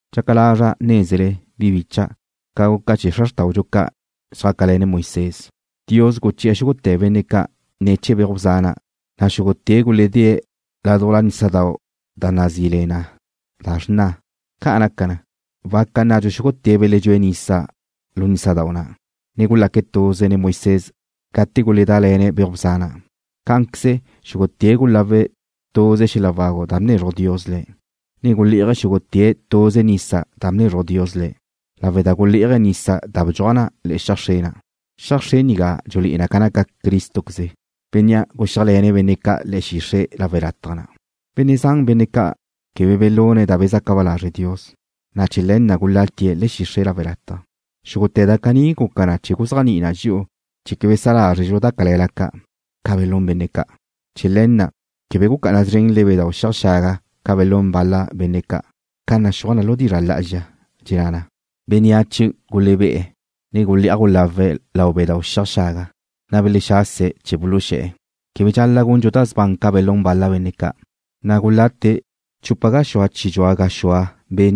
Dxaca lazra' nézele, bi bícha'dau', ca guca chee̱ xra xrtáudxu ca' xjácale̱ne̱' Moisés. Dios guché̱'e̱ xúgute̱ benne' ca' ne̱ chee̱ beuj bza na', na' xúgute̱' guledée̱' ládujla nísadau' da nazí le na Xrna. Ca' naca na, waca nnadxu xúgute̱' beledxúe̱' nisa lu nísadau' na', ne gulaque̱' tuze nen Moisés gate guledále̱ne̱' beuj bza na'. Cá'anqueze xúgute̱' gulawe̱' tuze xel-la wagu da bnezruj Dios le̱', ne gule'aj xúgute̱' tuze nisa da bnezruj Dios le̱', lawe' da gulé'aje̱' nisa na' bedxúaj na xiaj xre na'. Xiaj xre nigá dxulé'e na ca naca Crístoqueze, Bénnea' guxéajle̱ne̱' benne' ca' le̱'e̱ xixre' lawe' lataj na'. Benne' zan benne' ca' quebe belune̱' da bezaca ba lazre' Dios, na' chee̱ le̱ na' gulatie̱' le̱'e̱ xixre' lawe' lataj. Xúgute̱ da caní guca na chee̱ guzéajni'i na dxi'u chee̱ quebe sa lázredxu da cale̱la ca', ca belún benne' ca'. Chee̱ le̱ na' quebe gucá'ana szrenle bedáu' xiaj xaga ca' ca belún bal-la benne' ca', ca naxúaj na lu dizra' lá'azxa, dxenná na: Bénneache gulebé'e̱, ne gule'aj gulawe̱' lau bedáu' xiaj xaga, na' belexase̱' chee̱ buluxé̱'e̱. Quebe dxal-la' gundxu da sban ca belún bal-la benne' ca', na' tu zraze gulate chupa gaxúa chi dxua gaxue̱'.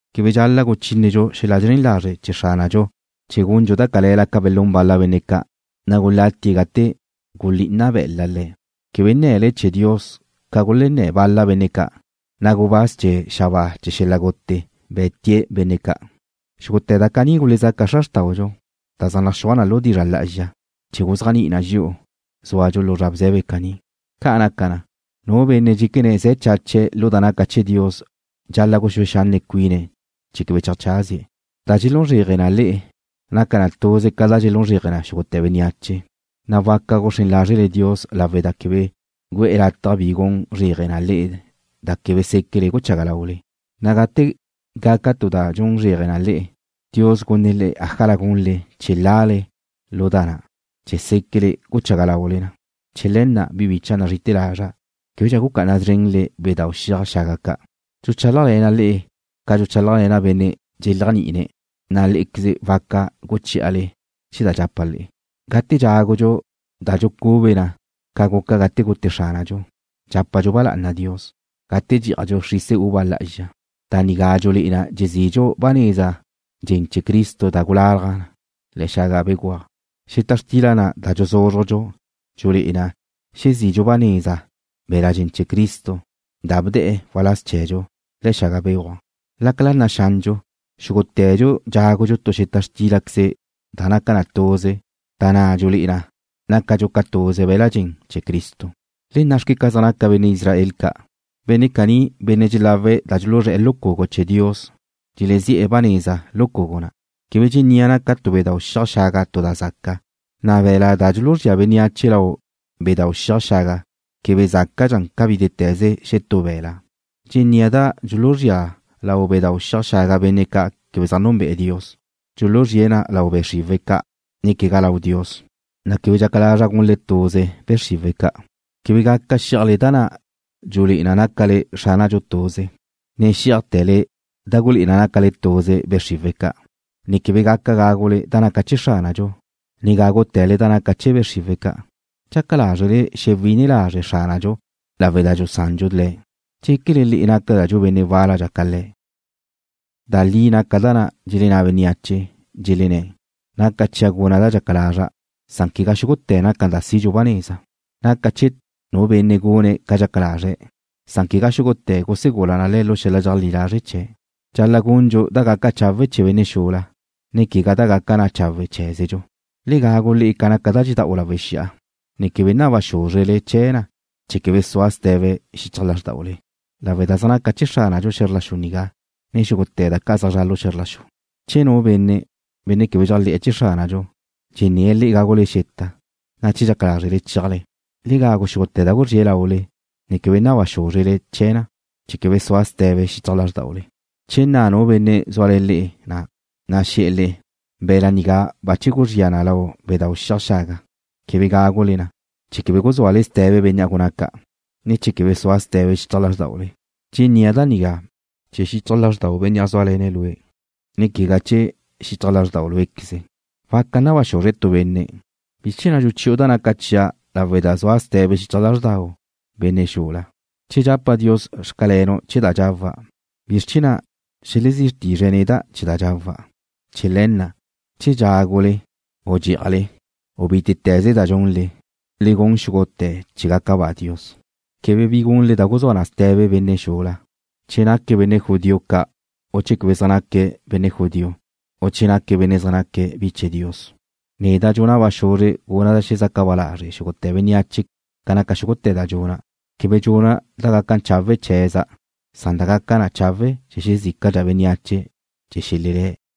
Quebe dxal-la' guchínedxu xel-la zren lazre' chee̱ Xránadxu chee̱ gundxu da cale̱la ca belún bal-la benne' ca', na' gulatie̱', gate gulí'ina be̱la' le̱'. Quebe nne̱le chee̱ Dios ca gulenné̱ bal-la benne' ca', na' gubáz chee̱ xabáa chee̱ xel-la gute be̱te̱' benne' ca'. Xúgute̱ da caní gulezaca xra xrtáudxu, na' zaj naxúaj na lu dizra' lá'azxa chee̱ guzéajni'i na dxi'u, zúadxu lu zra bze̱be caní. Ca' naca na, nu benne' dxéquene̱' ze̱ chache̱' lu da naca chee̱ Dios dxal-la' guxúe xanne' cuine̱' chee̱ quebe cheajcházie̱'. Da dxelún zréaje le'e naca na tuze ca da dxelún zréaje xúgute̱ bénneache, na' waca guxrén lázrele Dios lawe' da quebe gu'e̱ lataj bi gun zréaje le'e da quebe séquele guchaga laule, na' gate gaca tu da gun zréaje na le'e, Dios gunne̱' le'e ájala gunle chee̱ lale lu da na', chee̱ séquele guchaga laule na. Chee̱ le̱ na', bi bicha' nazri'ite̱ lazra', québedxa gucá'ana szrenle bedáu' xiaj xaga ca'. Dxuchálajle̱na' le'e ca dxuchálajle̱na' benne' dxeléajni'ine̱', na' lé'equeze waca guchí'ale chee̱ da dxapa' le'e. Gate dxágadxu da dxucube na ca guca gate gute Xránadxu, dxápadxu ba lá'ana Dios. Gate dxí'ajdxu xrisa uva lá'azxa, da nigá dxulé'e na dxezidxu ba neza dxen chee̱ Cristo da gulalaj na le̱'e̱ xaga béguaj. Xeta xtila na' da dxuzúzrujdxu dxulé'e na xezidxu ba neza be̱la' dxen chee̱ Cristo da bdee̱' waláz chee̱dxu le̱'e̱ xaga béguaj. Lácala naxandxu, xúgute̱dxu dxágudxu tu xeta xtílaqueze da naca na tuze, da na' dxulé'e na nácadxu ca tuze be̱la' dxen chee̱ Cristo. Le nna'xque ca zaj naca benne' Israel ca'. Benne' caní, benne' dxelawe̱' da dxuluzré̱'e̱ lu cugu chee̱ Dios dxelezi'e̱ ba neza lu cugu na'. Quebe dxennía' naca tu bedáu' xiaj xaga tu da zaca, na' be̱la' da dxuluzría bénneache lau bedáu' xiaj xaga quebe zácadxa ca bítete̱ze xetú be̱la'. Dxennía' da dxuluzría lau bedáu' xiaj xaga benne' ca' quebe zaj núnbe'e̱ Dios, dxuluzríe̱' na lau be' xriwe̱' ca' ne quegá lau Dios, na' quebe dxaca lazra' gunle tuze be' xriwe̱' ca'. Quebe gaca xí'ajle da na' dxulé'e na nácale Xránadxu tuze, ne xí'ajte̱le da gulé'e na nácale tuze be' xriwe̱' ca', ne quebe gaca gágule da naca na chee̱ Xránadxu, ne gágute̱le da naca na chee̱ be' xriwe̱' ca'. ¿Dxaca lázrele xewine lazre' Xránadxu lawe' da dxusandxu Le̱'? ¿Dxéquele le'e nácadxu benne' wáladxa ca Le̱'? Da li naca da na' dxelenná bénneache, dxelenné̱': Naca chia' guna' da dxaca lazra'. Quegá xúgute̱ naca na da sidxu ba neza. Naca chee̱ nu benne' gune̱' ca dxaca lazre̱' san quegá xúgute̱ gusegula na le̱' lu xel-la dxeajlí lazre' chee̱'. Dxal-la' gundxu da gaca chawe' chee̱ benne' xula, ne quegá da gaca na chawe' cheé̱zedxu. Le gagu le'e ca naca da dxeda'u lawe' xi'a, ne quebe naba xúzrele chee̱ na chee̱ quebe sua ste̱be xichaj lázrdaule, lawe' da zaj naca chee̱ Xránadxu xe̱zr la xu nigá, ne xúgute̱ da ca' zaj zra' lu xe̱zr la xu. Che nu benne', benne' quebe dxéajle̱'e̱ chee̱ Xránadxu, dxenné̱' le'e gágule xeta, na' che dxaca lázrele chéajle, le gagu xúgute̱ da guzríe̱' laule, ne quebe naba xúzrele chee̱ na chee̱ quebe sua ste̱be xichaj lázrdaule. Che nna nu benne' zúale̱ le'e, na' xe̱'e̱ le'e: “Be̱la' nigá bache guzría na lau bedáu' xiaj xaga”, quebe gágule na, chee̱ quebe guzúale ste̱be bénnea' gunné̱' ca', ne chee̱ quebe sua ste̱be xichaj lázrdaule. Dxennía' da nigá chee̱ xichaj lázrdau benne' zúale̱ne̱' lue', ne quegá chee̱ xichaj lázrdau' lué'queze. Waca naba xuzre tu benne': “¿Bizr chee̱ na' dxuchi'u da naca chia' lawe' da sua ste̱be xichaj lázrdau benne' xula? Che dxapa' Dios: Xcalenu' chee̱ da dxawa', ¿bizr chee̱ na' xelezí tizre̱' neda' chee̱ da dxawa'?” Chee̱ le̱ na', che dxágule u dxí'ajle, u bítete̱ze da dxunle, le gun xúgute̱ chee̱ gaca ba Dios. Quebe bi gunle da guzúa na ste̱be benne' xula, quegá benne' judío ca', ne quegá benne' quebe zaj naque̱' judío, ne quegá nu benne' naque̱' bi chee̱ Dios. Neda' dxuna' ba xuzre guna' da xelezaca ba lazre' xúgute̱ bénneache ca naca xúgute̱ da dxuna'. Quebe dxuna' da gaca chawe' chee̱za' san da gaca chawe' chee̱ xezícadxa bénneache chee̱ xelelé̱'.